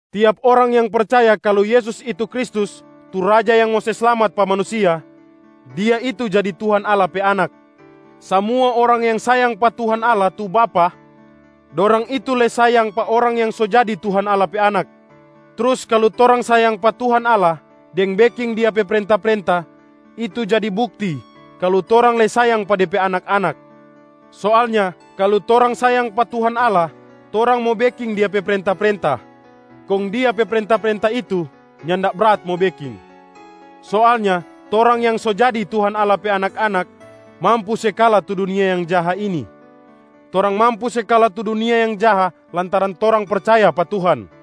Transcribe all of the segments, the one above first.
Tiap orang yang percaya kalu Yesus itu Kristus tu Raja yang mo se slamat pa manusia, dia itu jadi Tuhan Allah pe anak. Samua orang yang sayang pa Tuhan Allah tu Bapa, dorang itu lei sayang pa orang yang so jadi Tuhan Allah pe anak. Trus kalu torang sayang pa Tuhan Allah deng beking Dia pe prenta-prenta, itu jadi bukti kalu torang lei sayang pa De pe anak-anak. Soalnya kalu torang sayang pa Tuhan Allah, torang mo beking Dia pe prenta-prenta, kong Dia pe prenta-prenta itu nyanda brat mo beking. Soalnya torang yang so jadi Tuhan Allah pe anak-anak mampu se kala tu dunia yang jaha ini. Torang mampu se kala tu dunia yang jaha lantaran torang percaya pa Tuhan.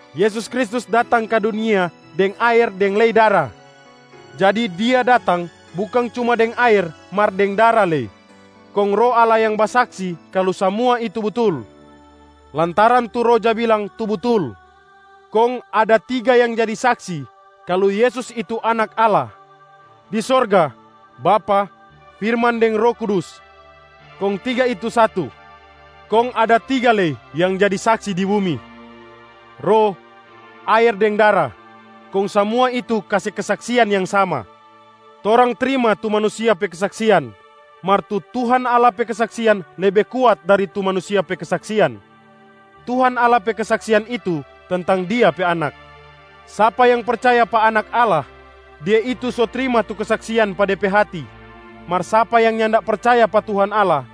Yesus Kristus datang ka dunia deng aer deng lei dara.a Jadi Dia datang bukang cuma deng aer mar deng dara lei. Kong Roh Allah yang basaksi kalu samua itu butul, lantaran tu Roh ja bilang tu butul. Kong ada tiga yang jadi saksi kalu Yesus itu Anak Allah [di sorga: Bapa, firman deng Roh Kudus, kong tiga itu satu. Kong ada tiga lei yang jadi saksi di bumi]: Roh, aer deng dara, kong samua itu kase kesaksian yang sama. Torang trima tu manusia pe kesaksian, mar tu Tuhan Allah pe kesaksian lebe kuat dari tu manusia pe kesaksian. Tuhan Allah pe kesaksian itu tentang Dia pe Anak. Sapa yang percaya pa Anak Allah, dia itu so trima tu kesaksian pa de pe hati. Mar sapa yang nyanda percaya pa Tuhan Allah,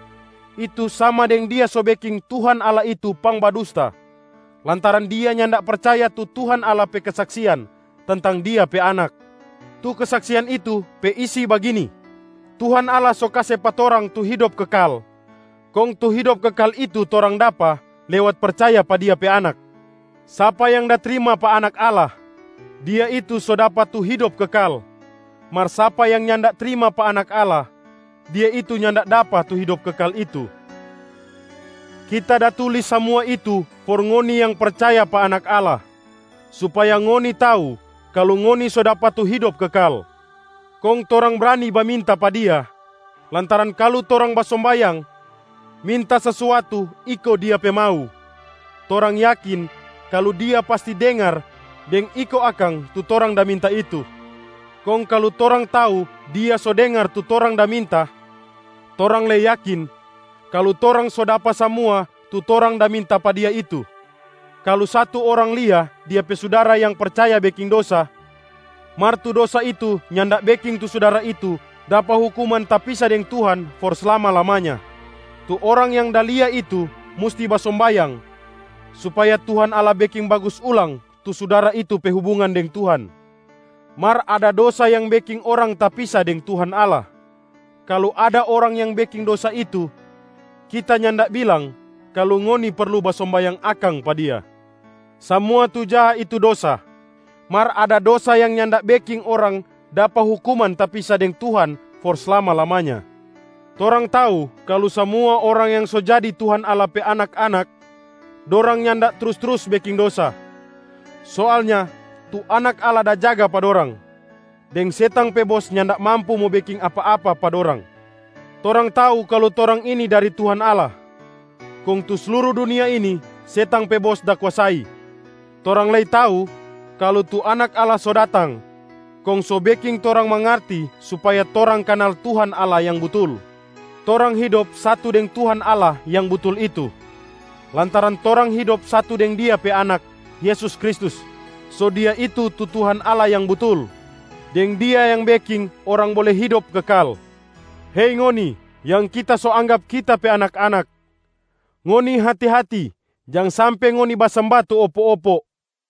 itu sama deng dia so beking Tuhan Allah itu pangbadusta lantaran dia nyanda percaya tu Tuhan Allah pe kesaksian tentang Dia pe Anak. Tu kesaksian itu pe isi bagini: Tuhan Allah so kase pa torang tu hidop kekal, kong tu hidop kekal itu torang dapa lewat percaya pa Dia pe Anak. Sapa yang da trima pa Anak Allah, dia itu so dapa tu hidop kekal. Mar sapa yang nyanda trima pa Anak Allah, dia itu nyanda dapa tu hidop kekal itu. Kita da tulis samua itu for ngoni yang percaya pa Anak Allah, supaya ngoni tau kalu ngoni so dapa tu hidop kekal. Kong torang brani baminta pa Dia lantaran kalu torang basombayang minta sesuatu iko Dia pe mau, torang yakin kalu Dia pasti dengar deng iko akang tu torang da minta itu. Kong kalu torang tau Dia so dengar tu torang da minta, torang lei yakin kalu torang so dapa samua tu torang da minta pa Dia itu. Kalu satu orang lia dia pe sudara yang percaya beking dosa, mar tu dosa itu nyanda beking tu sudara itu dapa hukuman tapisa deng Tuhan for slama-lamanya, tu orang yang da lia itu musti basombayang supaya Tuhan Allah beking bagus ulang tu sudara itu pe hubungan deng Tuhan. Mar ada dosa yang beking orang tapisa deng Tuhan Allah. Kalu ada orang yang beking dosa itu, kita nyanda bilang kalu ngoni perlu basombayang akang pa dia. Samua tu jaha itu dosa, mar ada dosa yang nyanda beking orang dapa hukuman tapisa deng Tuhan for slama-lamanya. Torang tau kalu samua orang yang so jadi Tuhan Allah pe anak-anak, dorang nyanda trus-trus beking dosa. Soalnya tu Anak Allah da jaga pa dorang, deng setang pe bos nyanda mampu mo beking apa-apa pa dorang. Torang tau kalu torang ini dari Tuhan Allah, kong tu sluru dunia ini setang pe bos da kuasai. Torang lei tau kalu tu Anak Allah so datang kong so beking torang mangarti supaya torang kanal Tuhan Allah Yang Butul. Torang hidop satu deng Tuhan Allah Yang Butul itu, lantaran torang hidop satu deng Dia pe Anak Yesus Kristus. So Dia itu tu Tuhan Allah Yang Butul deng Dia yang beking orang bole hidop kekal. Hei ngoni yang kita so anggap kita pe anak-anak, ngoni hati-hati, jang sampe ngoni basemba tu opo-opo.